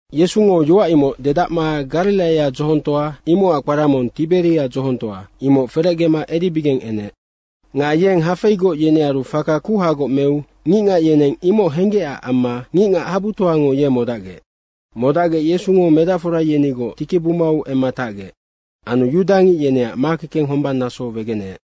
Yesungo yoac imoc dedacma Gariraia dzohongtoa, imocac kpara mong Tiberia dzohongtoa, imoc ferecgema edibigeng enec. Nga yeng hafeigoc yenearu faka kuhagoc meu ngicngac yeneng imoc henggecac amma ngicngac habutoango ye modacgec. Modacgec Yesungo medacfora yenigoc tikibumau emma tacgec. Anu yudangic yeneac makekeng hombang naso wegeneec.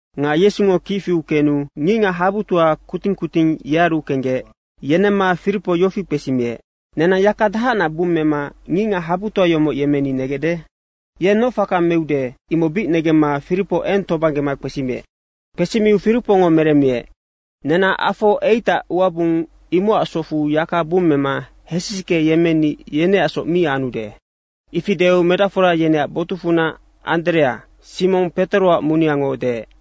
Nga Yesungo kic fiu kenu ngicngac habutoango kuting kuting yearu kenggec, yenemma Firipo yofi kpesimiec, “Nenang yaka dahacnac bummema ngicngac habutoa yomoc yemmeni negecde?” Yeng noc faka meude, imoc bic negemma Firipo eng tobanggema kpesimiec. Kpesimiu Firipongo meremmiec, “Nenang afo 8ac uabung, imocac socfu yaka bummema hesisicke yemmeni yeneacsoc mi anude.” Ifi deu medacfora yeneac botucfunac Anderea, Simong Petoroac muneango deec,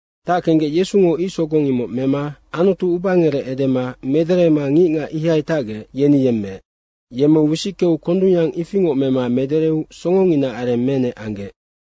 Tackenggec Yesungo ic sogong imoc mema Anutu ubangerec edema mederema ngicngac ihai tacgec, yeni yemmeec. Yemmeu wisickeu kondungyang ifingoc mema medereu songonginaac areng menec anggec.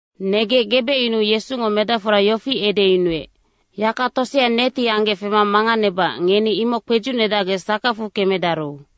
Negec gebecyunuu Yesungo medacfora yofi edeyunuec, “Yaka tosea neti anggec fema manganebacac ngeni imoc kpedzucnedacgec sakacfu kemedaru.”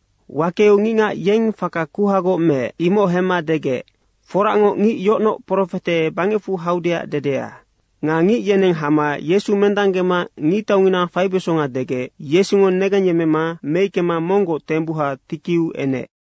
Wakeu ngicngac yeng faka kuhagoc meec, imoc hemma degec, “Foracngoc, ngic yocnoc profete bangecfu haudeac dedea.” Nga ngic yeneng hama Yesu mendanggema ngictaungina faibesonga degec Yesungo negengyemmema meickema monggoc tembuha tikiu enec.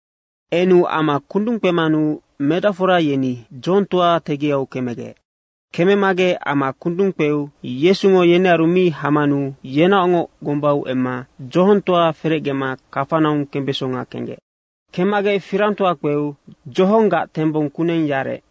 Enu ama kundung kpemanu medacfora yeni dzohongtoa tegiau kemegec. Kememagec ama kundung kpeu Yesungo yenearu mi hamanu yenaocngoc gombau emma dzohongtoa ferecgema Kafanaung kembesonga kenggec. Kemmagec firangtoa kpeu dzohonggac tembong kuneng yarec.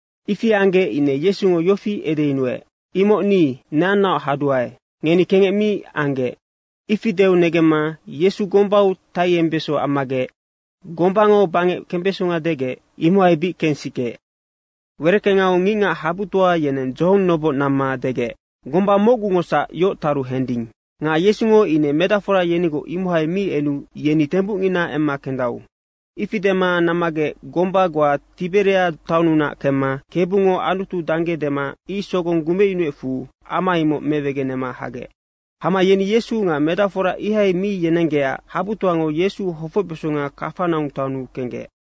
Ifi anggec ine Yesungo yofi edeyunuec, “Imoc ni, neannaoc haduae, ngeni kengec mi anggec.” Ifi deu negemma Yesu gombau taiembeso ammagec gombango bangec kembeso degec, imohai bic kensikeec. Wereckengau ngicngac habutoa yeneng dzohong noboc namma degec, “Gomba mocgungosac yoc taru hending. Nga Yesungo ine medacfora yenigoc imohai mi enu yeni tembucngina emma kendau.” Ifi dema nammagec gomba goa Tiberia taonnunac kemma, Kebungo Anutu dangge dema ic sogong gumecyunuecfu, ama imoc mewegenema hagec. Hama yeni Yesu nga medacfora ihai mi yenenggecac habutoango Yesu hofocbesonga Kafanaung taonnu kenggec.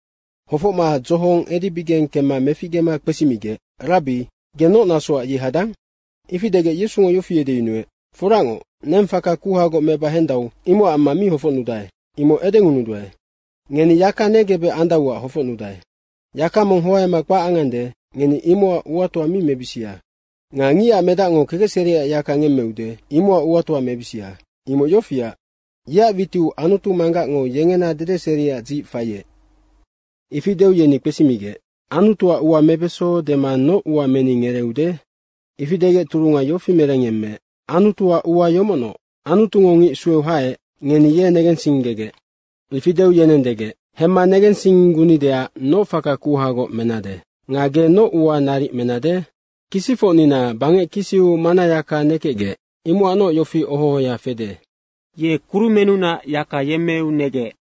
Hofocma dzohong edibigeng kemma meficgema kpesimigec, “Rabbi, ge noc nasoac yei hadang?” Ifi degec Yesungo yofi edeyunuec, “Foracngoc, neng faka kuhagoc meba hendau, imocac amma mi hofocnudae, imoc edengunuduae. Ngeni yaka negebec andauac hofocnudae. Yaka mong hoaema kpac angande, ngeni imocac uatoa mi mebisia. Nga Ngicac Medacngo kekecseriac yaka ngemmeude, imocac uatoa mebisia. Imoc yofiac, yeac witiu Anutu Manggacngo yengena dedeseriac dzic faiec.” Ifi deu yeni kpesimigec, “Anutuac ua mebeso dema noc ua meni ngereeude?” Ifi degec turunga yofi merengyemmeec, “Anutuac ua yomocnoc. Anutungo ngic sueu haec, ngeni ye negensinggegec.” Ifi deu yeneng degec, “Hemma negensinggunideac noc faka kuhagoc menade nga ge noc ua naric menade? Kisicfocnina bangec kisiu mannayaka nekecgec, imocacnoc yofi oho ohoya fede, ‘Ye kurumennunac yaka yemmeu negec.’”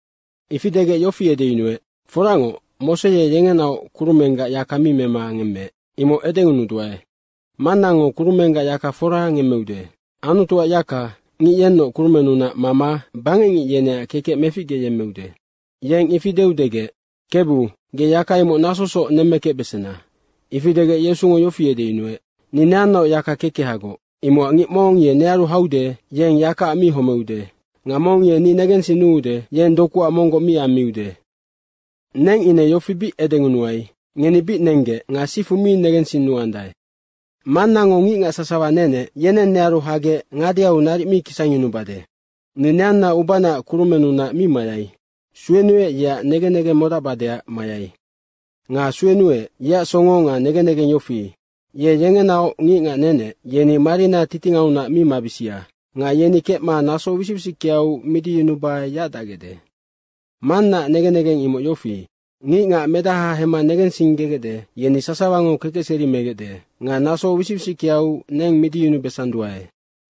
Ifi degec yofi edeyunuec, “Foracngoc, Mose ye yengenaoc kurumenggac yaka mi mema ngemmeec, imoc edengunuduae. Mannango kurumenggac yaka fora ngemmeude. Anutuac yaka, ngic yennoc kurumennunac mama bangecngic yeneac kekec meficgeyemmeude.” Yeng ifi deu degec, “Kebu, ge yaka imoc nasosoc nemmekecbesena.” Ifi degec Yesungo yofi edeyunuec, “Ni neannaoc yaka kekehagoc, imocac ngic mong ye nearu haude, yeng yakaac mi homeude nga mong ye ni negensinnuude, yeng dokuac monggoc mi ammiude. Neng ine yofi bic edengunuai, ngeni bic nenggec nga sifu mi negensinnuandae. Mannango ngicngac sasawa nenec, yeneng nearu hagec ngadeau naric mi kisangyunubade. Ni neanna ubanaac kurumennunac mi mayai. Suenuec, yeac negen negeng modacbadeac mayai. Nga suenuec, yeac songo nga negen negeng yofi, ye yengenaoc ngicngac nenec, yeni marina titingaunac mi mabisia nga yeni kecma naso wisic wisickeau midiyunuba yacdacgecde. Mannaac negen negeng imoc yofi, ngicngac Medaha hemma negensinggegecde, yeni sasawango kekecseri megecde. Nga naso wisic wisickeau neng midiyunubesanduae.”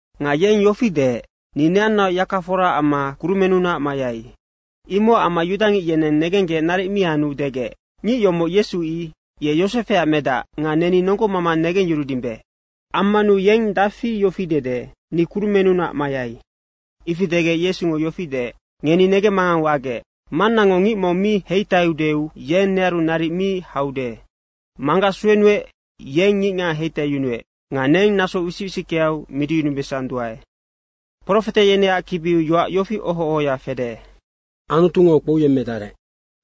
Nga yeng yofi deec, “Ni neannaoc yaka fora amma kurumennunac mayai.” Imocac amma yudangic yeneng negenggec naric mi anu degec, “Ngic yomoc Yesu, i. Ye Yosefeac medac nga neni nonggomama negengyurudimbe. Ammanu yeng dafi yofi dede, ‘Ni kurumennunac mayai.’” ifi degec Yesungo yofi deec, “Ngeni negemmangang wagec. Mannango ngic mong mi heitaiudeu yeng nearu naric mi haude. Manggac suenuec, yeng ngicngac heitaiyunuec nga neng naso wisic wisickeau midiyunubesanduae. Profete yeneac kibiu yoac yofi oho ohoya fede, ‘Anutungo kpouyemmedarec.’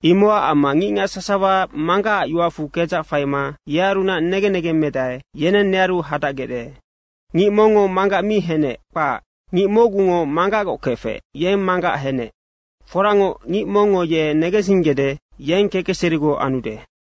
Imocac amma ngicngac sasawa Manggacac yoacfu kedzac faima yearunac negen negeng medae, yeneng nearu hadacgecde. Ngic mongngo Manggac mi henec, kpac. Ngic mocgungo Manggacgoc kefec, yeng Manggac henec. Foracngoc, ngic mongngo ye negensinggede, yeng kekecserigoc anude.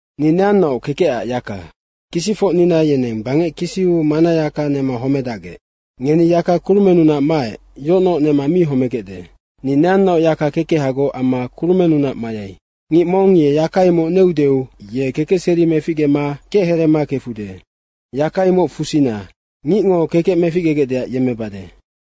Ni neannaoc kekecac yaka. Kisicfocnina yeneng bangec kisiu mannayaka nema homedacgec. Ngeni yaka kurumennunac maec, yocnoc nema mi homegecde. Ni neannaoc yaka kekehagoc amma kurumennunac mayai. Ngic mong ye yaka imoc neudeu ye kekecseri meficgema kechereema kefude. Yaka imoc fusina. Ngicngo kekec meficgegecdeac yemmebade.”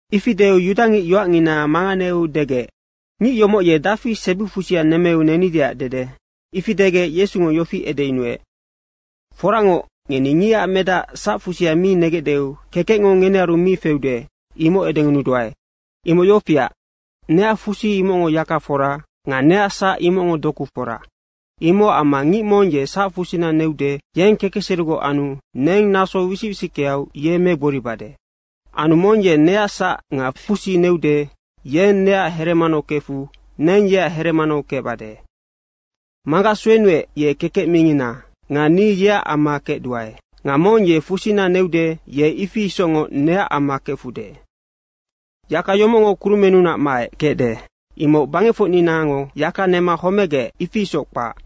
Ifi deu yudangic yoacngina manganeu degec, “Ngic yomoc ye dafi sebifusia nemmeu nenideac dede?” Ifi degec Yesungo yofi edeyunuec, “Foracngoc, ngeni Ngicac Medac sacfusia mi negecdeu kekecngo ngenearu mi feude, imoc edengunuduae. Imoc yofiac, neac fusi, imocngo yaka fora nga neac sac, imocngo doku fora, imocac amma ngic mong ye sacfusina neude, yeng kekecserigoc anu neng naso wisic wisickeau ye megboribade. Anu mong ye neac sac nga fusi neude, yeng neac heremanau kefu neng yeac heremanau kecbade. Manggac suenuec, ye kekec mingina nga ni yeac amma kecduae. Nga mong ye fusina neude, ye ifi isocngoc neac amma kefude. Yaka yomocngo kurumennunac maec kecde, imoc bangecfocninango yaka nema homegec, ifi isoc kpac.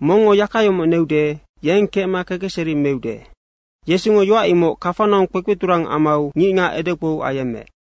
Mongngo yaka yomoc neude, yeng kecma kekecseri meude.” Yesungo yoac imoc Kafanaung kpekpeturang amau ngicngac edekpou ayemmeec.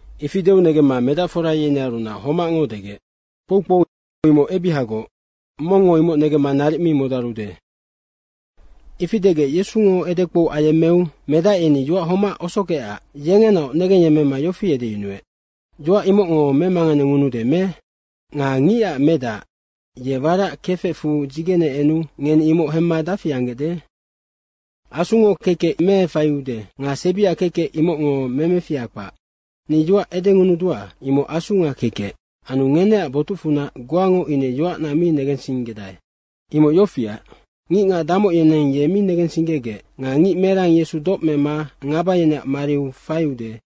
Ifi deu negemma medacfora yenearunac homacngo degec, “Kpoukpou imoc ebihagoc, mongngo imoc negemma naric mi modarude.” Ifi degec Yesungo edekpou ayemmeu medac yeni yoac homac osogecac yengenaoc negengyemmema yofi edeyunuec, “Yoac imocngo memanganengunude me? Nga Ngicac Medac ye warac kefecfu dzigene enu ngeni imoc hemma dafi anggecde? Asungo kekec meefaiude nga sebiac kekec, imocngo memefiha kpac. Ni yoac edengunudua, imoc Asu nga kekec. Anu ngeneac botucfunac goango ine yoacna mi negensinggedae.” Imoc yofiac, ngicngac damoc yeneng ye mi negensinggegec nga ngic merang Yesu doc mema ngaba yeneac mariu faiude,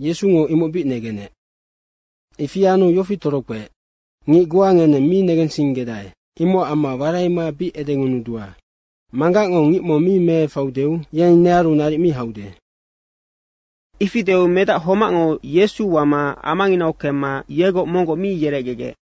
Yesungo imoc bic negenec. Ifi anu yofi torokpeec, “Ngic goa ngeneng mi negensinggedae, imocac amma waraima bic edengunudua, Manggacngo ngic mong mi meefaiudeu, yeng nearu naric mi haude.” Ifi deu medac homacngo Yesu wama amanginau kemma yegoc monggoc mi yerecgegec.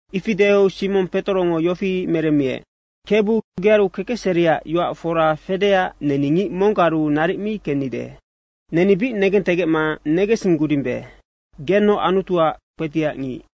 Ifi deu Simong Petorongo yofi meremmiec, “Kebu, gearu kekecseriac yoac fora fedeac neni ngic monggaru naric mi kennide. Neni bic negentegecma negensinggudimbe, genoc Anutuac Kpetiacngic.”